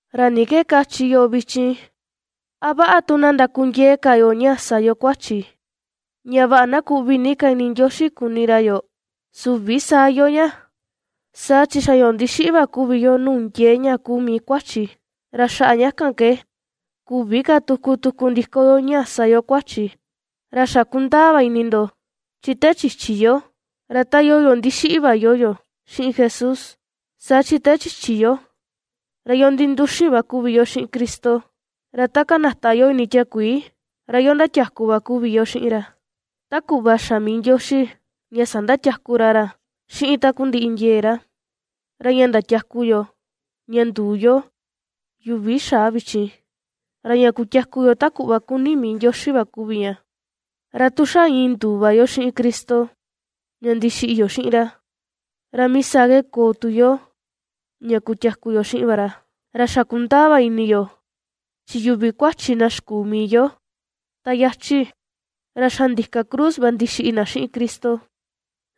¿Ra ni ke kachi yo vichin? ¿A vaꞌa tu na ndakundiee ka yo ^sa yo kuachi, ña vaꞌa na kuꞌvi ni ka ini Ndioxi kuni ra yoo? ¡Süvi saa iyoo ña! Saa chi xa yo ndixiꞌi va kuvi yo nuu ndiee ña kuu mii kuachi, ra xaꞌa ña kan ke küvi ka tuku tuku ndiko yo ña ^sa yo kuachi. Ra xa kundaa va ini ndo, chi te chichi yo, ra ta iyoo yo ndixiꞌi va iyoo yo xiꞌin Jesús. Saa chi te chichi yo, ra yo ninduxin va kuvi yo xiꞌin Cristo, ra ta kanata yo ini tiakuii, ra yo ndatiaku va kuvi yo xiꞌin ra, ta kuꞌva xa mii Ndioxi ña sandatiaku ra ra xiꞌin takundiꞌi ndiee ra; ra ña ndatiaku yo ña nduu yo yuvi xaa vichin, ra ña kutiaku yo ta kuꞌva ^kuni mii Ndioxi va kuvi ña. Ra tu xa iin nduu va yo xiꞌin Cristo ña ndixiꞌi yo xiꞌin ra, ra mii saa ke koo tu yo ña ^kutiaku yo xiꞌin va ra. Ra xa kundaa va ini yo, chi yuvi kuachi na xikuu mii yo ta yachi, ra xa ndika cruz va ndixiꞌi na xiꞌin Cristo,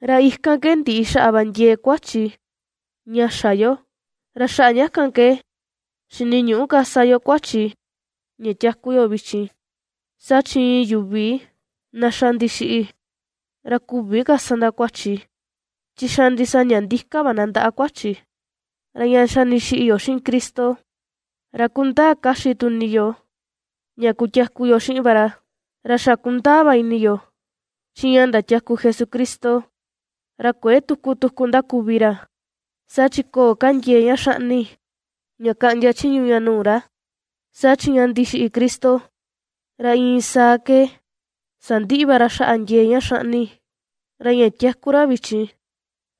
ra ikan ke ndiꞌi xaꞌa va ndiee kuachi ña xa yo, ra xaꞌa ña kan ke xiniñüꞌu ka sa yo kuachi ña tiaku yo vichin. Saa chi iin yuvi na xa ndixiꞌi, ra ^küvi ka sa na kuachi, chi xa ndisaña ndika va na ndaꞌa kuachi. Ra ña xa ndixiꞌi yo xiꞌin Cristo, ra kundaa kaxi tu ini yo ña kutiaku yo xiꞌin va ra. Ra xa kundaa va ini yo, chi ña ndatiaku Jesucristo, ra kuëe tuku tuku ^ndakuvi ra, saa chi köo ka ndiee ña xaꞌni ña kaꞌndia chiñu ña nuu ra. Saa chi ña ndixiꞌi Cristo, ra iin saa ke sandiꞌi va ra xaꞌa ndiee ña xaꞌni, ra ña ^tiaku ra vichin,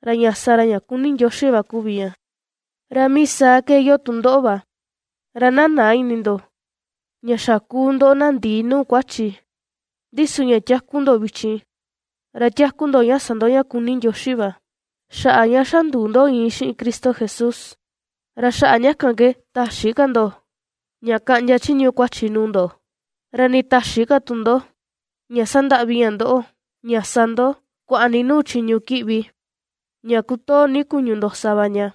ra ña sa ra ña kuni Ndioxi va kuvi ña. Ra mii saa ke iyoo tu ndoꞌo va, ra na näa ini ndo, ña xa ^kuu ndo na ndii nuu kuachi, ndi su ña tiaku ndo vichin, ra tiaku ndo ña sa ndo ña kuni Ndioxi va, xaꞌa ña xa nduu ndo iin xiꞌin Cristo Jesús. Ra xaꞌa ña kan ke täxi ka ndo ña kaꞌndia chiñu kuachi nuu ndo, ra nii täxi ka tu ndo ña sandaꞌvi ña ndoꞌo ña sa ndo kuaꞌa ni nuu chiñu kiꞌvi ña kutoo ni kuñu ndo sa va ña.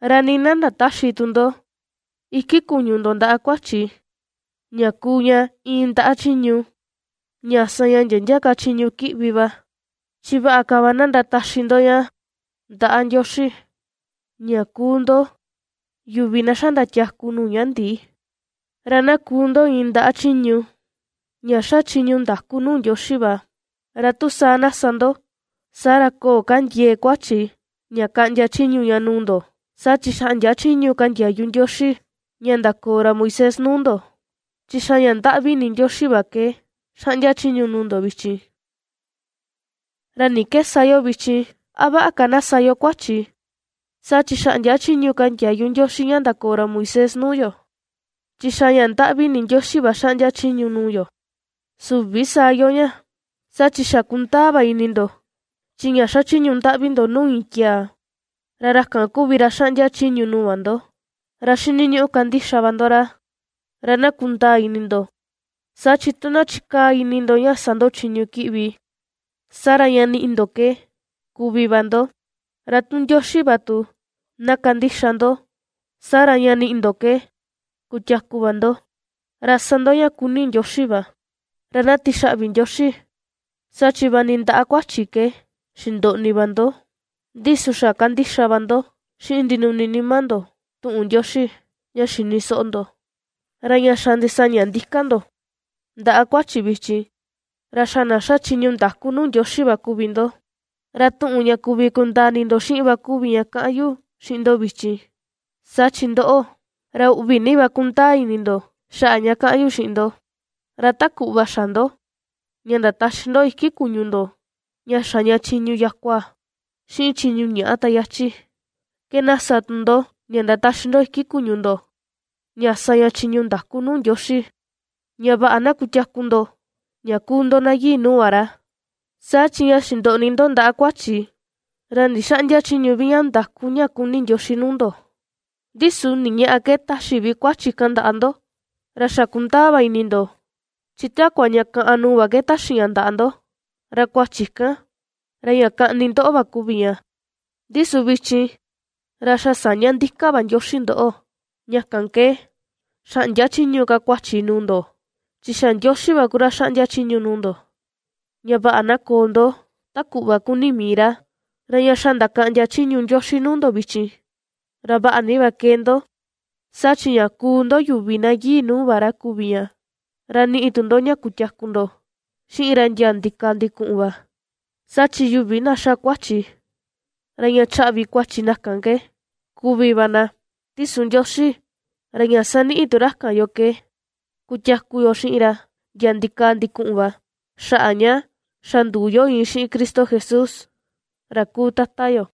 Ra nii na ndatäxi tu ndo iki kuñu ndo ndaꞌa kuachi, ña kuu ña iin ndaꞌa chiñu ña sa ña ndia ndia ka chiñu kiꞌvi va, chi vaꞌa ka va na ^ndataxi ndo ña ndaꞌa Ndioxi, ña ^kuu ndo yuvi na xa ndatiaku nuu ña ndii, ra na ^kuu ndo iin ndaꞌa chiñu ña ^xa chiñu ndaku nuu Ndioxi va. Ra tu saa na sa ndo, saa ra köo ka ndiee kuachi ña kaꞌndia chiñu ña nuu ndo, saa chi xäꞌndia chiñu ka ndiayu Ndioxi ña ndakoo ra Moisés nuu ndo, chi xa ña ndaꞌvi ini Ndioxi va ke xaꞌndia chiñu nuu ndo vichin. ¿Ra ni ke sa yo vichin? ¿A vaꞌa ka na sa yo kuachi, saa chi xäꞌndia chiñu ka ndiayu Ndioxi ña ndakoo ra Moisés nuu yo, chi xa ña ndaꞌvi ini Ndioxi va xaꞌndia chiñu nuu yo? ¡Süvi saa iyoo ña! Saa chi xa kundaa va ini ndo, chi ña xachiñu ndaꞌvi ndo nuu iin tiaa, ra ra kan kuvi vi ra ^xaꞌndia chiñu nuu va ndo, ra xiniñuꞌu kandixa va ndo ra. Ra na kundaa ini ndo, saa chi tu na chikaa ini ndo ña sa ndo chiñu kiꞌvi, saa ra ña niꞌi ndo ke kuvi va ndo; ra tu Ndioxi va tu na kandixa ndo, saa ra ña niꞌi ndo ke kutiaku va ndo, ra sa ndo ña kuni Ndioxi va. Ra na tixaꞌvi Ndioxi, saa chi vaꞌa ni ndaꞌa kuachi ke xindoꞌni va ndo, ndi su xa kandixa va ndo xiꞌin ndinuni nima ndo tuꞌun Ndioxi ña xini soꞌo ndo. Ra ña xa ndisaña ndika ndo ndaꞌa kuachi vichin, ra xa na ^xa chiñu ndaku nuu Ndioxi va kuvi ndo. (Ra tuꞌun ña kuvi kundaa ini ndo xiꞌin va kuvi ña kaꞌan yu xiꞌin ndo vichin, saa chi ndoꞌo, ra uꞌvi ni va ^kundaa ini ndo xaꞌa ña kaꞌan yu xiꞌin ndo.) Ra ta kuꞌva xa ndo, ña ndataxi ndo iki kuñu ndo ña xa ña chiñu yakua xiꞌin chiñu ñaꞌa ta yachi, ke na sa tu ndo ña ndataxi ndo iki kuñu ndo, ña sa ña chiñu ndaku nuu Ndioxi, ña vaꞌa na ^kutiaku ndo ña kuu ndo na yii nuu va ra. Saa chi ña xindoꞌni ndo ndaꞌa kuachi, ra ndixäꞌndia chiñu vi ña ndaku ña kuni Ndioxi nuu ndo. ¿Ndi su ni ñaꞌa ke taxi vi kuachi kan ndaꞌa ndo? Ra xa kundaa va ini ndo, chi takua ña kaꞌan nuu va ke taxi ña ndaꞌa ndo; ra kuachi kan, ra ña kaꞌni ndoꞌo va kuvi ña. Ndi su vichin, ra xa sa̱ñá ndika va Ndioxi ndoꞌo, ña kan ke xäꞌndia chiñu ka kuachi nuu ndo, chi xa Ndioxi va kuvi ra xaꞌndia chiñu nuu ndo, ña vaꞌa na koo ndo, ta kuꞌva kuni mii ra. Ra ña xa ndakaꞌndia chiñu Ndioxi nuu ndo vichin, ra vaꞌa ni va ^kee ndo, saa chi ña kuu ndo yuvi na yii nuu va ra kuvi ña, ra niꞌi tu ndo ña kutiaku ndo xiꞌin ra ndia ndikaa ndikuꞌun va. Saa chi yuvi na ^xa kuachi, ra ña chaꞌvi kuachi kan na ke kuvi va na, ndi su Ndioxi, ra ña saniꞌi tu ra kan yoo ke kutiaku yo xiꞌin ra ndia ndikaa ndikuꞌun va, xaꞌa ña xa nduu yo iin xiꞌin Cristo Jesús, ra kuu Tata yo.